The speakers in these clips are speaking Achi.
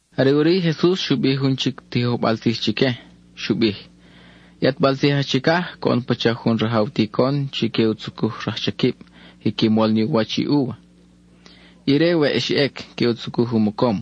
(Are ʼuri i Jesus xu bij jun chic tijojbal tzij chique, xu bij:) —I ʼatbal tzij aj chicaj coʼon pacha jun rajaw ticon chi que u tzucuj rajchaquib quiqui mol ni u wach i úva. Ire weʼ xa ʼec, que u tzucuj u mocom.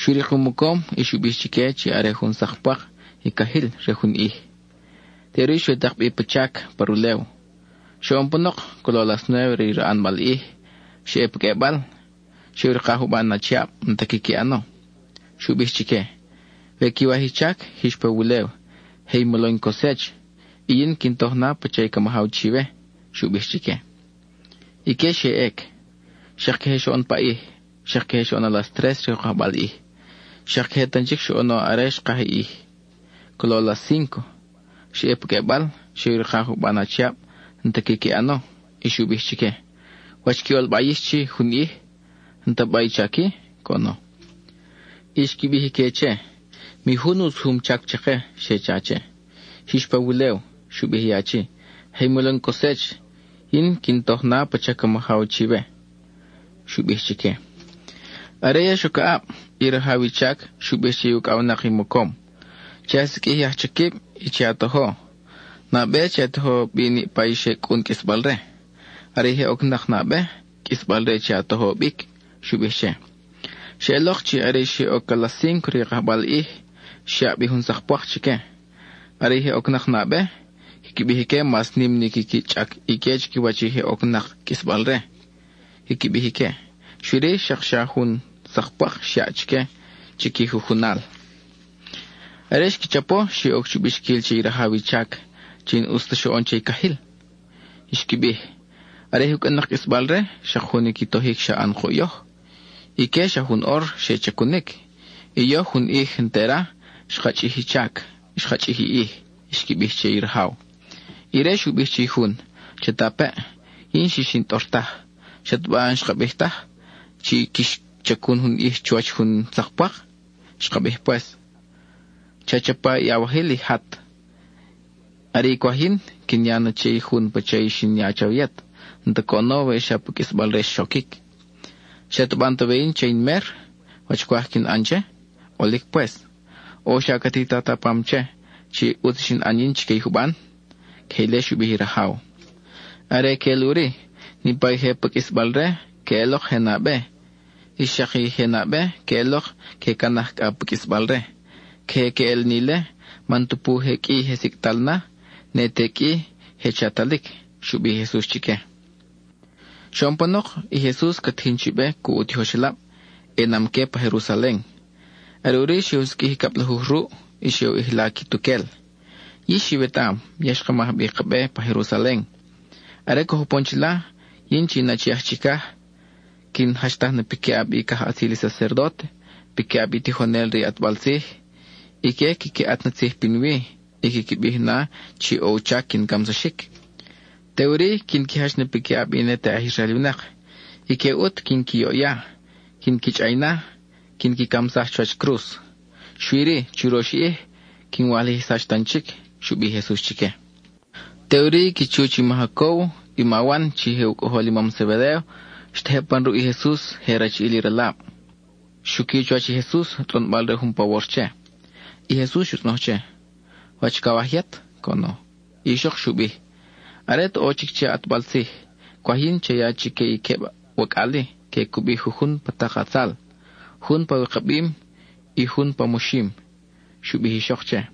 Xu rik u mocom y xu bij chique chi are jun sak pwak i cajil re jun ʼij. Teʼuri xe u tak bi pa chac pa rulew. Xoʼon panok, colo a las nuéve re i raʼanbal ʼij, xa ʼe pa qʼuebal. Xe u rika juban achiab n-ta quiqui ʼano. Xu bij chique: “We quiwaj i chac, jix pa wulew, je i molo in cosech; y yin quin toj na pacha ca majaw chiwe,” xu bij chique. Ique xe ʼec. Xak queje xoʼon paʼij, xak queje xoʼon a las tres re u kajbal ʼij. Xak queje tan chic xoʼono are xkaj i ʼij, colo a las cínco: xa ʼe pa qʼuebal, xe u rika juban achiab n-ta quiqui ʼano. Y xu bij chique: “¿Wach qui ʼolba yix chi, jun ʼij? ¿N-ta ba i chac-i?” coʼono. Y xqui bij ique che: “Mi jun u sujum chac chake,” xe cha che. “Jix pa wulew,” xu bij i achi, “je i molo in cosech; yin quin toj na pacha ca majaw chiwe,” xu bij chique. Are ya xoc aʼab, i rajaw i chac xu bij che i ucʼawnak i mocom: “Che a siqʼuij i ajchaquib y che a tojo. Nabe che a tojo bi niʼpa i xe cʼun qʼuisbal-re. Are i je ocnak nabe, qʼuisbal-re che a tojo bic,” xu bij che. Xeʼelok chi are i xe oc a las cínco re i kajbal ʼij, xyaʼ bi jun sak pwak chique. Are i je ocnak nabe, quiqui bij ique mas nim ni quiqui chʼac ique chiquiwach i je ocnak qʼuisbal-re, quiqui bij ique. Xui-ri, xak xa jun sak pwak xyaʼ chique chiqui jujunal. Are xqui chapo, xe oc chu bixquil che i rajaw i chac chi n-ʼus ta xoʼon che i cajil. Xqui bij: “Are i je cʼun-nak qʼuisbal-re, xak jun i qui tojic xa ʼan kuʼ yoj. Ique, xa jun ʼor xe chacunic, y yoj jun ʼij entera xka chʼij i chac, xka chʼij i ʼij,” xqui bij che i rajaw. Ire xu bij che i jun, “Chatapeʼ, yin n-xix in tʼor taj. ¿Xataba n-xka bij ta wa, chi quix chacun jun ʼij chuwach jun sak pwak? Xka bij pues. Cha chapa i awajil y jat. Are i cwaj yin, quin ya na che i jun pacha i xin ya chawe yet; n-ta coʼono we xa pa qʼuisbal-re xoquic. ¿Xataba n-ta we yin che in mer, wach cwaj quin ʼan che? ʼOlic pues. ¿O xa ca titat a pam che, chi ʼutz xin ʼan yin chique i juban?” Queje ile xu bij i rajaw. Are queʼel ʼuri, niʼpa i je pa qʼuisbal-re, queʼelok je nabe; y xak i je nabe, que ʼelok que canaj cʼa pa qʼuisbal-re. Queje queʼel ni ile, man tupu je qʼui i je sicʼtal na, ne te qʼui je chatalic —xu bij i Jesus chique. Xoʼon panok, i Jesus ca tijin chi be cuʼ u tijoxelab, ʼenam-que pa Jerusalen. Are ʼuri xe u siqʼuij i cablajuj ruʼ, y xe u ʼijla quituquel: —Yix iwetaʼam ya xka maj bi ka be pa Jerusalen. Are coj upon chila, yin chi in Achi aj Chicaj, quin jachtaj na piquiʼab i cajʼatzil i sacerdóte, piquiʼab i tijonel re i ʼatbal tzij. Ique quiqui ʼat na tzij pinwi y quiqui bij na chi ʼo u chac quin camsaxic. Teʼuri quin qui jach na piquiʼab i ne te aj Israel winak: ique ʼut quin qui yoʼya, quin qui chʼay na, quin qui camsaj chuwach cruz. Xui-ri, churox ʼij, quin walijsax tan chic —xu bij i Jesus chique. Teʼuri i qui chuch i ma Jacóbo i ma Wan, chi je u cʼojol i mam Zebedéo, xtejeb pan ruʼ i Jesus je rachiʼil i ralab. Xuqui chuwach i Jesus, tzʼonbal-re jun pawor che. I Jesus xu tzʼonoj che: —¿Wach cawaj yet? —coʼono. I ixok xu bij: —Are at ʼo chic che a ʼatbal tzij, cwaj yin cha ya chique i queb wacʼal-i que cubi jujun pa tak a tzal, jun pa wikabim, y jun pa moxim —xu bij i ixok che.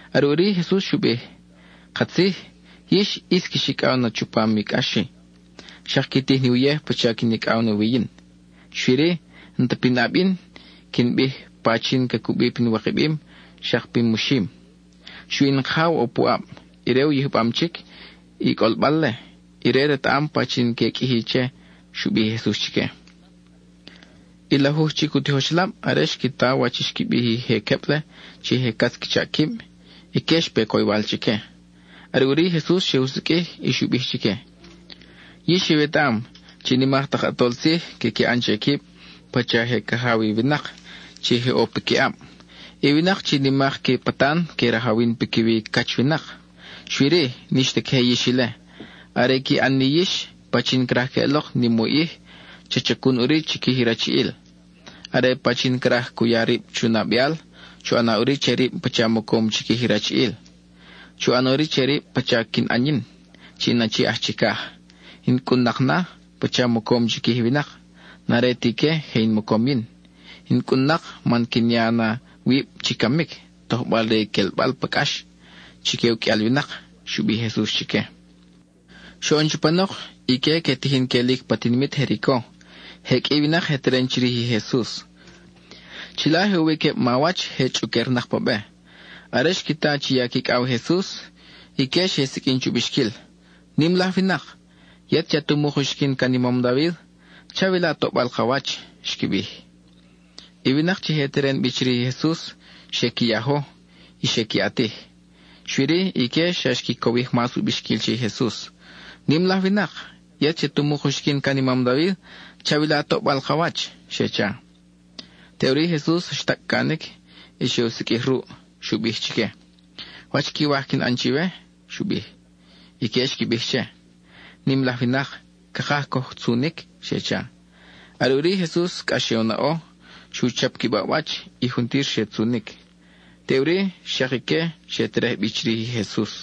Are ʼuri i Jesus xu bij: —Katzij, yix ʼis quix icʼaw na chupam i cʼax-i, xak qui tij ni uyej pacha quin icʼaw wi yin. Xui-ri, n-ta pinʼab yin quin bij pachin ca cubi pin wikabim xak pin moxim. Xui in Kajaw ʼo puʼab; ire u yijbam chic i cʼolbal-le, ire retaʼam pachin que qʼuiji che —xu bij i Jesus chique. I lajuj chic u tijoxelab, are xqui ta wach i xqui bij i je queb-le chi je catz qui chaʼ quib, ique xpe coywal chique. Are ʼuri i Jesus xe u siqʼuij y xu bij chique: —Yix iwetaʼam chi i nimak tak ʼatol tzij quiqui ʼan che quib pacha je cajaw i winak chi je ʼo piquiʼab; i winak chi nimak qui patan que rajawin piquiwi i cach winak. Xui-ri; n-ix ta queje yix ile. Are i qui ʼan ni yix, pachin craj queʼelok nim u ʼij, cha chacun ʼuri chiquij i rachiʼil. Are pachin craj cu ya rib chu nabeal, chu ʼana ʼuri che rib pacha mocom chiquij i rachiʼil. Chu ʼana ʼuri che rib pacha quin ʼan yin chi in Achi aj Chicaj; in cʼun-nak na, pacha mocom chiquij i winak; n-are ti ique je in mocom yin. In cʼun-nak man quin ya na wib chi camic, tojbal-re i quelbal pa cʼax chique uqʼuial winak —xu bij i Jesus chique. Xoʼon chupanok, ique que tijin quelic pa tinimit Jerico, je qʼui i winak je teren chirij i Jesus. Chila je ʼo wi queb mawach je chʼuquernak pa be. Are xqui ta chi ya quicʼaw i Jesus, ique xe siqʼuin chu bixquil: —¡Nim laj winak! ¡Yet chi at umuk uxiquin can i mam David, chawila toʼbal ka wach! —xqui bij. I winak chi je teren bi chirij i Jesus xe qui yajo y xe qui ʼatij. Xui-ri, ique xa xqui cowij mas u bixquil che i Jesus: —¡Nim laj winak! ¡Yet chi at umuk uxiquin can i mam David, chawila toʼbal ka wach! —xe cha. Teʼuri i Jesus xtacʼ canic y xe u siqʼuij ruʼ. Xu bij chique: —¿Wach quiwaj quin ʼan chiwe? —xu bij. Ique xqui bij che: —Nim laj winak, cakaj coj tzunic —xe cha. Are ʼuri i Jesus cʼax xe u naʼo. Xu chap qui baʼwach y juntir xe tzunic. Teʼuri xak ique xe terej bi chirij i Jesus.